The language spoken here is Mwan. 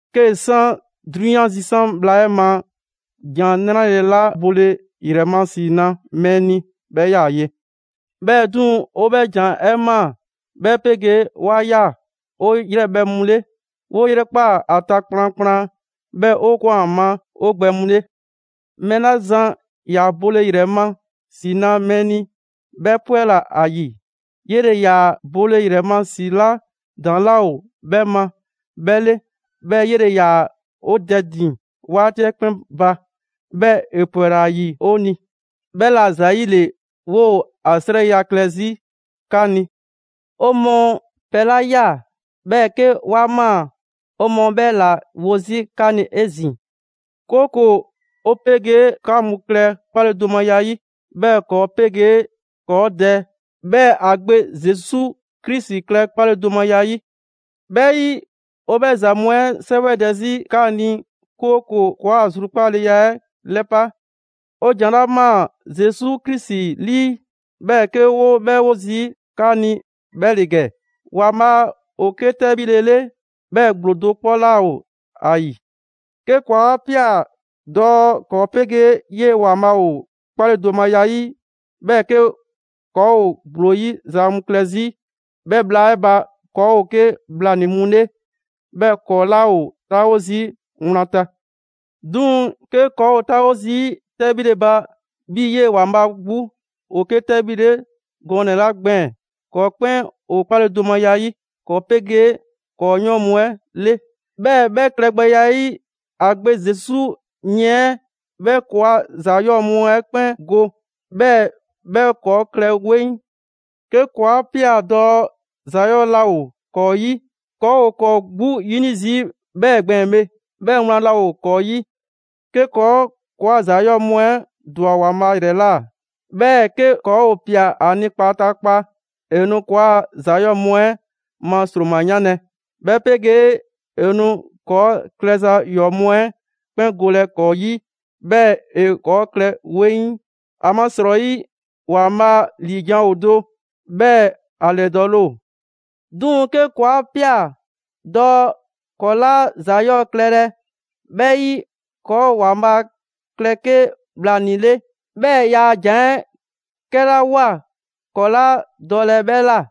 'Kee‑ san 'drunyan zisan' bhla 'ɛ ma, ‑Jan 'Nrale‑ 'la bole ‑yrɛ ma ‑si na mɛɛ ni 'bhɛ 'yaa‑ ye. 'Bhɛɛ‑ 'duŋ‑ 'o 'bhɛ ‑Jan 'ɛ ꞊maa, 'bhɛ 'pegee‑ 'wa ꞊ya 'o 'yrɛbhɛ‑ mu 'le, 'woo 'yrɛkpa ‑a ta kplankplan, 'bhɛɛ‑ 'o ꞊kwan ‑a ma 'o gbɛ mu 'le. Mɛɛ 'la zan ‑yaa bole ‑yrɛ ma ‑si na mɛɛ ni 'bhɛ 'pwɛla‑ ‑a ‑yi. 'Yele‑ ‑yaa bole ‑yrɛ ma ‑si 'la ‑daŋ' 'laa ‑o 'bhɛ ma 'bhɛ ‑le, 'bhɛɛ‑ 'yele‑ ‑yaa 'o Dɛ ‑din 'waati 'ɛ 'kpɛn ba, 'bhɛɛ‑ ‑e ‑pwɛla ‑a ‑yi 'o ni. 'Bhɛla‑ ‑zayile 'woo‑ ‑a 'srɛya‑ klɛ 'zi 'ka ni. 'O mɔɔ pɛ 'la ꞊ya, 'bhɛɛ‑ 'ke 'wa ꞊maa, 'o mɔɔ 'bhɛ ‑la 'wo 'zi 'ka ni 'ezin‑; 'kooko‑ 'o 'pegee 'ka mu klɛ 'kpaledomaya 'yi. 'Bhɛɛ‑ ‑kɔɔ' 'pegee ‑kɔɔ' Dɛ, 'bhɛɛ‑ ‑a Gbe Zesu Krisi klɛ 'kpaledomaya 'yi. 'Bhɛ 'yi, 'o 'bhɛ ‑za mu 'ɛ 'sɛwɛdɛ 'zi 'ka ni, 'kooko‑ ‑kɔɔa' zrukpaaleya 'ɛ ‑lɛpa'. 'O ‑jan 'la ꞊maa Zesu Krisi 'lii, 'bhɛɛ‑ 'ke 'woo‑ 'bhɛ 'wo zii' 'ka ni, 'bhɛ ‑le ‑gɛ: ‑Waanbhaa' ‑o 'ke 'tɛbhile 'le, 'bhɛɛ‑ ‑gblo do 'kpɔ 'laa ‑o ‑a ‑yi. 'Ke ‑kɔɔ' 'a ꞊pia dɔɔ ‑kɔɔ' 'pegee 'yee‑ ‑Waanbhaa' ‑o 'kpaledomaya 'yi, 'bhɛɛ‑ 'ke ‑kɔɔ' ‑gblo 'yi za mu klɛ 'zi, 'bhɛ bhla 'ɛ ba ‑kɔɔ' ‑o 'ke bhlanii‑ mu 'le, 'bhɛɛ‑ ‑kɔɔ' 'laa ‑o 'taawo zii' wlan ta. 'Duŋ‑, 'ke ‑kɔɔ' 'taawo zii' 'tɛbhile ba 'bhii‑ 'yee‑ ‑Waanbhaa' 'gbu ‑o 'ke 'tɛbhile 'le gɔnɛ‑ 'la gbɛɛn‑, ‑kɔɔ' 'kpɛn ‑o 'kpaledomaya 'yi ‑kɔɔ' 'pegee ‑kɔɔ' 'yɔɔn mu 'ɛ 'le; 'bhɛɛ‑ 'bhɛ klɛgbɛya 'ɛ 'yi, ‑a Gbe Zesu yiɛn 'ɛ 'bhɛ ‑kɔɔa' ‑za 'yɔɔ‑ mu 'ɛ 'kpɛn go, 'bhɛɛ‑ 'bhɛ ‑kɔɔ' klɛ 'weŋ. 'Ke ‑kɔɔ' 'a ꞊pia dɔɔ ‑za 'yɔɔ‑ laa ‑o ‑kɔɔ' 'yi, ‑kɔɔ' ‑o ‑kɔɔ' 'gbu 'yini zii' 'bhɛɛ‑ gbɛɛn‑ bhe, 'bhɛɛ‑ wlan 'laa ‑o ‑kɔɔ' 'yi. 'Ke ‑kɔɔ' ‑kɔɔa' ‑za 'yɔɔ‑ mu 'ɛ ‑dwa ‑Waanbhaa' ‑yrɛ ꞊la, 'bhɛɛ‑ 'ke ‑kɔɔ' ‑o ꞊pia ‑a ni kpataakpa, ‑e nu ‑kɔɔa' ‑za 'yɔɔ‑ mu 'ɛ ma ‑sroma 'yanlɛ‑, 'bhɛ 'pegee ‑e nu ‑kɔɔ' klɛza 'yɔɔ‑ mu 'ɛ 'kpɛn golɛ ‑kɔɔ' 'yi, 'bhɛɛ‑ ‑e ‑kɔɔ' klɛ 'weŋ. ‑Amasrɔyi, ‑Waanbhaa' ‑liijan' ‑o do, 'bhɛɛ‑ ‑a ‑lɛdɔɔle ‑o. 'Duŋ‑, 'ke ‑kɔɔ' 'a ꞊pia dɔɔ ‑kɔɔ' 'laa ‑za 'yɔɔ‑ klɛlɛ, 'bhɛ 'yi, ‑kɔɔ' ‑Waanbhaa' klɛ 'ke bhlanii‑ 'le; 'bhɛɛ‑ yaa ‑jan 'ɛ 'kɛla ꞊woa ‑kɔɔ' 'laa dɔlɛ 'bhɛ ꞊la.